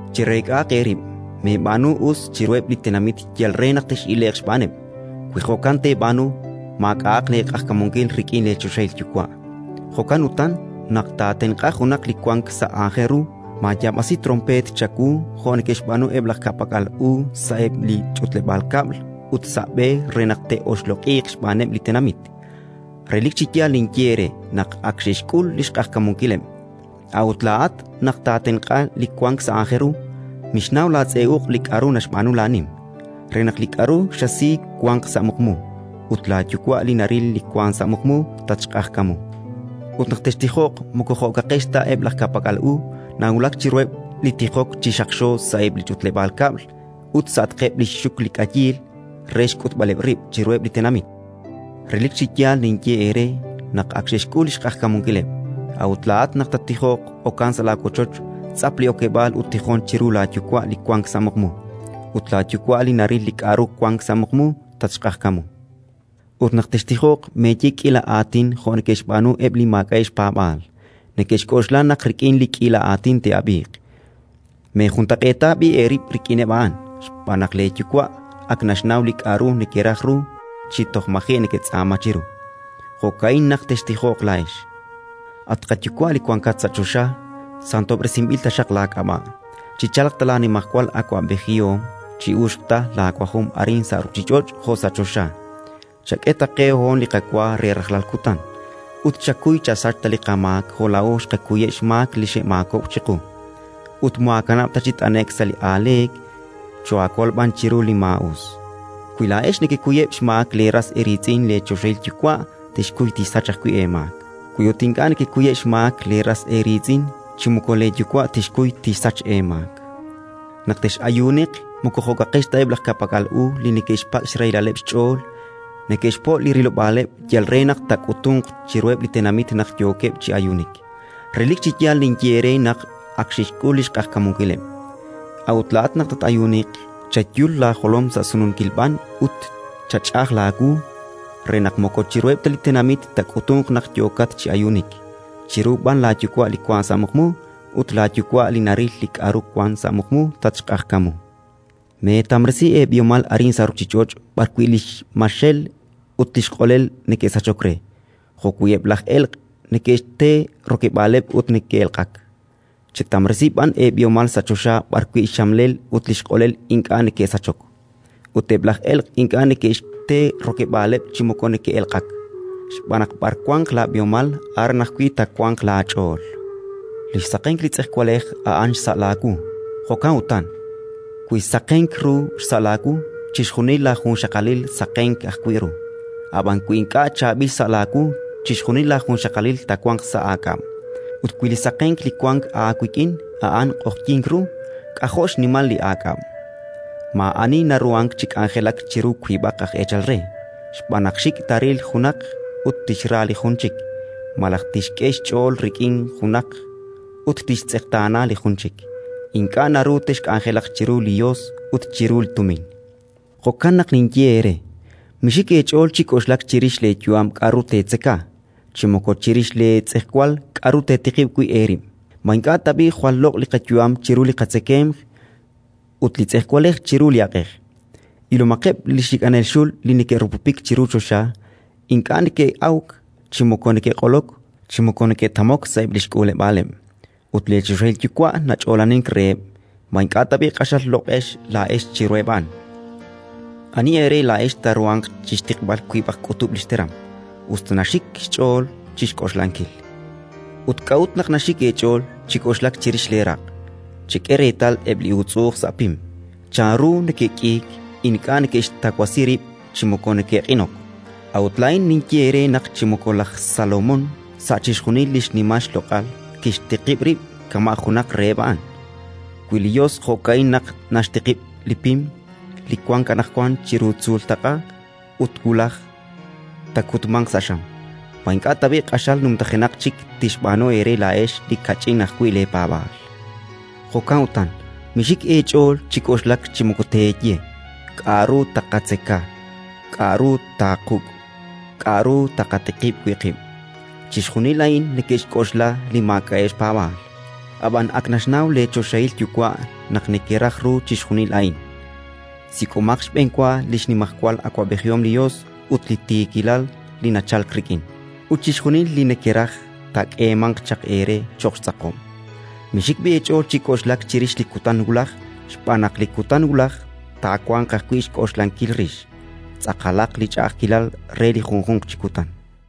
“Chereek'ahaq eerib', meeb'aanu li us chiruheb' li tenamit yal re naq tex'ile'q xb'aaneb'; wi jo'kan teeb'aanu, maak'a'aq leeq'ajkamunkil rik'in leechoxahil Yuwa'. “Jo'kan utan, naq taatenq'a junaq li wank sa' aajel ru, maayaab'asi tronpeet chawu jo' neke'xb'aanu eb' laj ka'pak'al u sa'eb' li ch'utleb'aal kab'l ut sa' b'e re naq te'oxloq'iiq xb'aaneb' li tenamit. Relik chi yaal ninye eere naq ak xe'xk'ul li xq'ajkamunkileb'. A'ut laa'at, naq taatenq'a li wank sa' aajel ru, mixnaw laatz'e uq' li k'aru naxb'aanu laanim, re naq li k'aru xasi wanq sa' muqmu; ut laaYuwa' li naril li wank sa' muqmu, tatxq'ajkamu. “Ut naq textijoq, moko jo'kaqex ta eb' laj ka'pak'al u: nawulak chiruheb' li tijok chi xaqxo sa'eb' li ch'utleb'aal kab'l ut sa'atqeb' li xxuk li k'ayiil re xk'utb'aleb' rib' chiruheb' li tenamit. Relik chi yaal ninye eere naq ak xe'xk'ul li xq'ajkamunkileb'. A'ut laa'at, naq tattijoq, okan sa' laawochoch, tz'ap li okeb'aal ut tijon chiru laaYuwa' li wank sa' muqmu; ut laaYuwa' li naril li k'aru wank sa' muqmu, tatxq'ajkamu. “Ut naq textijoq, meeye k'iila aatin jo' neke'xb'aanu eb' li maak'a'eb' xpaab'aal: neke'xk'oxla naq rik'in li k'iila aatin te'ab'iiq. Meejuntaq'eeta b'i' eerib' rik'ineb' a'an, xb'aan naq leeYuwa' ak naxnaw li k'aru nekeraj ru chi toj maji' neketz'aama chiru. Jo'ka'in naq textijoq laa'ex: «At qaYuwa' li wankat sa' choxa, santob'resinb'il taxaq laak'ab'a', chichalq ta laanimajwal awab'ejihom, chi'uxq ta laawajom arin sa' ruuchich'och' jo' sa' choxa. Chak'e ta qe hoon li qawa re rajlal kutan, ut chakuy chasach ta li qamaak jo' laa'o xqakuyeb' xmaak li xe'maakob'k chiqu. Ut moohaakanab' chi t'ane'k sa' li aaleek, choohaakol b'an chiru li maa'us». “Wi laa'ex nekekuyeb' xmaak leeras eeriitz'in, leechoxahil Yuwa' tixkuy tixsach ajwi' eemaak. Wi ut ink'a' nekekuyeb' xmaak leeras eeriitz'in, chi moko leeYuwa' tixkuy tixsach eemaak. “Naq tex'ayuuniq, moko jo'kaqex ta eb' laj ka'pak'al u li neke'xpak' xrahilaleb' xch'ool: neke'xpo' li rilob'aaleb' yal re naq taak'utunq chiruheb' li tenamit naq yookeb' chi ayuunik. Relik chi yaal ninye eere naq ak xe'xk'ul li xq'ajkamunkileb'. A'ut laa'at, naq tat-ayuuniq, chayul laajolom sa' sununkil b'an ut chach'aj laawu, re naq moko chiruheb' ta li tenamit taak'utunq naq yookat chi ayuunik, chiru b'an laaYuwa' li wank sa' muqmu; ut laaYuwa' li naril li k'aru wank sa' muqmu, tatxq'ajkamu. “Meetamresi eeb'ihomal arin sa' ruuchich'och' b'arwi' li xmaxel ut li xq'olel neke'sachok re, jo'wi' eb' laj elq' neke'xte rokeb'aaleb' ut neke'elq'ak. Chetamresi b'an eeb'ihomal sa' choxa b'arwi' li xmaxel ut li xq'olel ink'a' neke'sachok, ut eb' laj elq' ink'a' neke'xte rokeb'aaleb' chi moko neke'elq'ak. Xb'aan naq b'ar wanq laab'ihomal, aran ajwi' taawanq laach'ool. “Li xsaqenk li tz'ejwalej a'an li xsa' laawu. Jo'kan utan, wi saqenk ru xsa' laawu, chixjunil laajunxaqalil saqenaq ajwi' ru; ab'an wi ink'a' chaab'il xsa' laawu, chixjunil laajunxaqalil taawanq sa' aak'ab'. Ut wi li saqenk li wank aawik'in a'an q'oqyink ru, k'ajo' xnimal li aak'ab'! “Maa'ani naruhank chi k'anjelak chiru wiib'aq aj eechal re, xb'aan naq xik' taaril junaq ut tixra li jun chik, malaj tixk'e xch'ool rik'in junaq ut tixtz'eqtaana li jun chik. Ink'a' naru texk'anjelaq chiru li Yos ut chiru li Tumin. “Jo'kan naq ninye eere: Mixik eech'ool chi k'oxlak chirix leeyu'am k'aru teetzeka, chi moko chirix leetz'ejwal k'aru teetiqib' wi' eerib'. Ma ink'a' tab'i' jwal loq' li qayu'am chiru li qatzekemq, ut li tz'ejwalej chiru li aq'ej? Ilomaqeb' li xik'anel xul li neke'rupupik chiru choxa: ink'a' neke'awk, chi moko neke'q'olok, chi moko neke'tamok sa'eb' li xk'uuleb'aaleb'; ut leechoxahil Yuwa' nach'oolanink reheb'. Ma ink'a' tab'i' q'axal loq'ex laa'ex chiruheb' a'an? Ani eere laa'ex taaruhanq chi xtiqb'al wiib'aq k'utub' li xteram, us ta naxik xch'ool chi xk'oxlankil? “Ut k'a'ut naq naxik eech'ool chi k'oxlak chirix leeraq'? Chek'e reetal eb' li uutz'u'uj sa' pim, chanru neke'k'iik: ink'a' neke'xtawasi rib' chi moko neke'q'inok. A'ut laa'in ninye eere naq chi moko laj Salomón sa' chixjunil li xnimal xloq'al kixtiqib' rib' kama' junaq reheb' a'an. Wi li Yos jo'ka'in naq naxtiqib' li pim li wank anaqwan chiru tzuultaq'a ut wulaj taakutmanq sa' xam, ma ink'a' tab'i' q'axal numtajenaq chik tixb'aanu eere laa'ex li kach'in ajwi' leepaab'aal? Jo'kan utan, mixik eech'ool chi k'oxlak chi moko teeye: «K'aru taaqatzeka? K'aru taaquk'? K'aru taaqatiqib' wi' qib'?». Chixjunil a'in neke'xk'oxla li maak'a'eb' xpaab'aal. Ab'an ak naxnaw leechoxahil Yuwa' naq nekeraj ru chixjunil a'in. Sik'omaq xb'enwa li xnimajwal awab'ejihom li Yos ut li tiikilal li nachalk rik'in, ut chixjunil li nekeraj taak'eemanq chaq eere cho'q xtz'aqob'. Mixik b'i' eech'ool chi k'oxlak chirix li kutan wulaj, xb'aan naq li kutan wulaj taawanq ajwi' xk'oxlankil rix. Tz'aqalaq li ch'a'ajkilal re li junjunq chi kutan.